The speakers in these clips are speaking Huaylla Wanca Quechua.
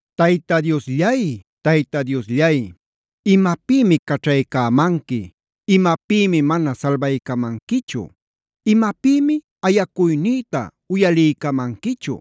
Tayta Diosllay, Tayta Diosllay, ¿imapïmi caćhaycämanqui?b ¿Imapïmi mana salbaycamanquichu? ¿Imapïmi ayacuynïta uyaliycamanquichu?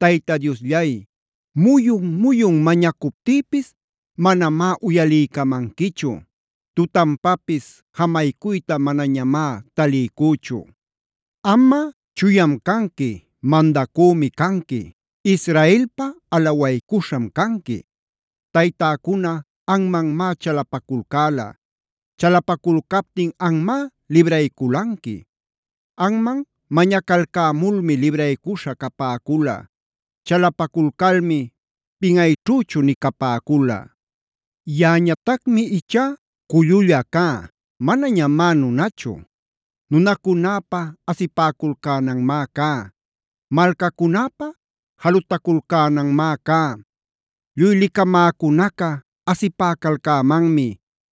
Tayta Diosllay, muyun-muyun mañacuptïpis manamá uyaliycamanquichu. Tutanpapis jamaycuyta manañamá taliycüchu. Amꞌa, chuyam canqui, mandacümi canqui, Israelpa alawaycuśham canqui. Taytäcuna anmanmá chalapaculcäla. Chalapaculcaptin anmá librayculanqui. Anman mañacalcämulmi libraycuśha capäcula. Chalapaculcalmi pinꞌayćhüchu nï capäcula. Yaꞌañatacmi ichá cululla cá; manañamá nunachu. Nunacunäpa asipäculcänanmá cá, malcacunäpa jalutaculcänanmá cá. Lluy licamäcunaca asipäcalcämanmi.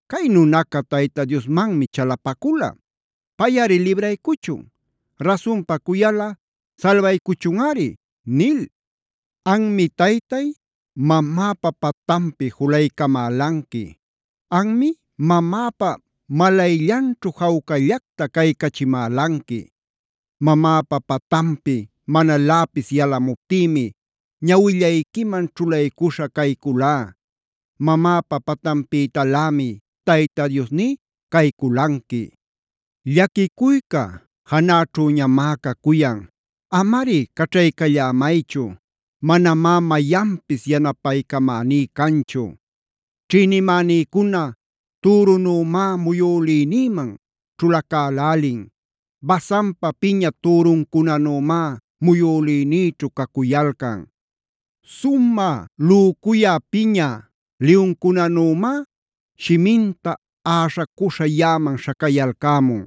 “Cay nunaca Tayta Diosmanmi chalapacula. Payꞌari libraycuchun. Rasunpa cuyalꞌa salbaycuchunꞌari”d nil. Anmi Taytay, mamäpa patanpi julaycamälanqui. Anmi mamäpa malayllanćhu jawcallacta caycachimälanqui. Mamäpa patanpi manaläpis yalamuptïmi ñawillayquiman ćhulaycuśha cayculá. Mamäpa patanpïtalämi Tayta Diosní cayculanqui. Llaquicuyca janäćhüñamá cacuyan. Amari caćhaycallämaychu. Manamá mayanpis yanapaycamäní canchu. Ćhïnimänïcuna türunümá muyülïnïman ćhulacälälin. Basanpa piña türuncunanümá muyülïnïćhu cacuyalcan. Sumä lücuya piña liyuncunanümá shiminta äśhacuśha yaꞌaman śhacayalcämun.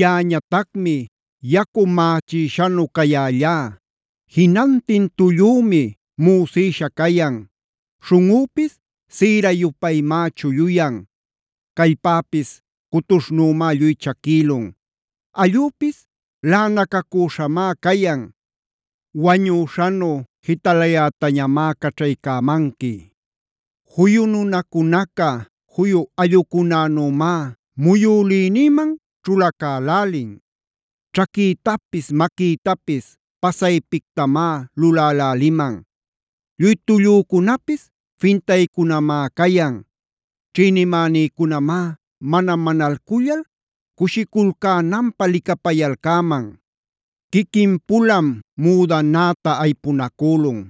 Yaꞌañatacmi yacu mächïshanu cayällá. Jinantin tullümi müsïsha cayan. Śhunꞌüpis sïra-yupaymá chulluyan. Callpäpis cutuśhnümá lluy chaquïlun. Allüpis laꞌanacacüśhamá cayan. Wañüśhanu jitalayätañamá caćhaycämanqui. Juyu nunacunaca juyu allꞌucunänümá muyülïnïman ćhulacälälin. Ćhaquïtapis, maquïtapis pasaypictamá luläläliman. Lluy tullücunapis fintaycunamá cayan. Ćhïnimänïcunamá mana manalcullal cushiculcänanpä licapayalcäman. Quiquin-pulam müdanäta aypunacülun.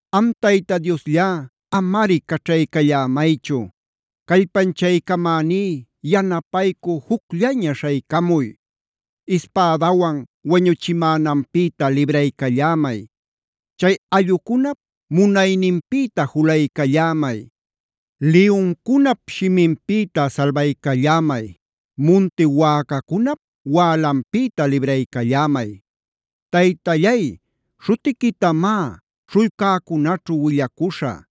Am Tayta Diosllá, amari caćhaycallämaychu. Callpanchaycamäní yanapaycü jucllaña śhaycamuy. Ispädawan wañuchimänanpïta libraycallämay. Chay allꞌucunap munayninpïta julaycallämay. Liyuncunap shiminpïta salbaycallämay. Munti wäcacunap wälanpïta libraycallämay. Taytallay, śhutiquitamá śhullcäcunaćhu willacuśhä.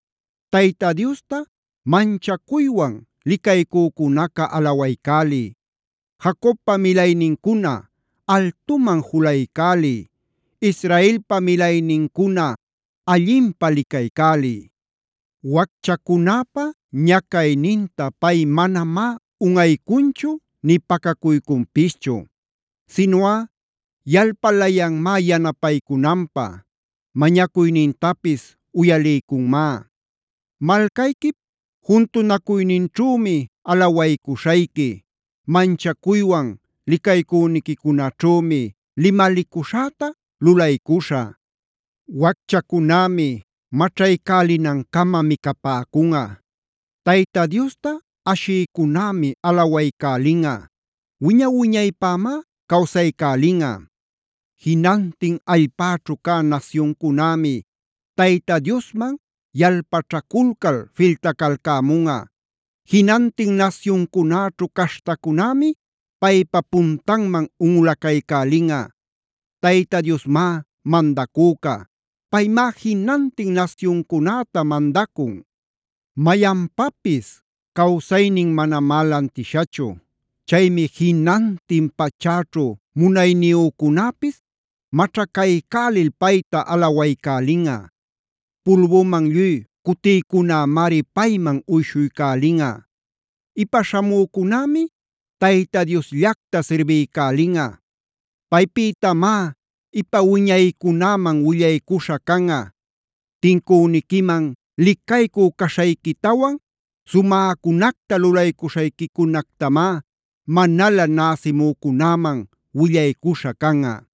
Tayta Diosta manchacuywan licaycücunaca alawaycäliy. ¡Jacobpa milaynincuna altuman julaycäliy! ¡Israelpa milaynincuna allinpä licaycäliy! Wacchacunäpa ñacayninta pay manamá unꞌaycunchu nï pacacuycunpischu. Sinuꞌa yalpalayanmá yanapaycunanpä. Mañacuynintapis uyaliycunmá. Malcayquip juntunacuyninćhümi alawaycuśhayqui. Manchacuywan licaycüniquicunaćhümi limalicuśhäta lulaycuśhä. Wacchacunämi maćhaycälinancama micapäcunꞌa. Tayta Diosta ashïcunämi alawaycälinꞌa. Wiña-wiñaypämá cawsaycälinꞌa. Jinantin allpäćhu cä nasyuncunämi Tayta Diosman yalpaćhaculcal filtacalcämunꞌa. Jinantin nasyuncunäćhu caśhtacunämi paypa puntanman unꞌulaycälinꞌa. Tayta Diosmá mandacüca. Paymá jinantin nasyuncunäta mandacun. Mayanpapis cawsaynin manamá lantishachu. Chaymi jinantin pachäćhu munayniyücunäpis maćhacaycälil payta alawaycälinꞌa. Pulbuman lluy cutïcunämari payman uyshuycälinꞌa. Ipa śhamücunämi Tayta Diosllacta sirbiycälinꞌa. Paypïtamá ipa wiñaycunäman willaycuśha canꞌa. Tincüniquiman licaycü caśhayquitawan, sumäcunacta lulaycuśhayquicunactamá manalä näsimücunäman willaycuśha canꞌa.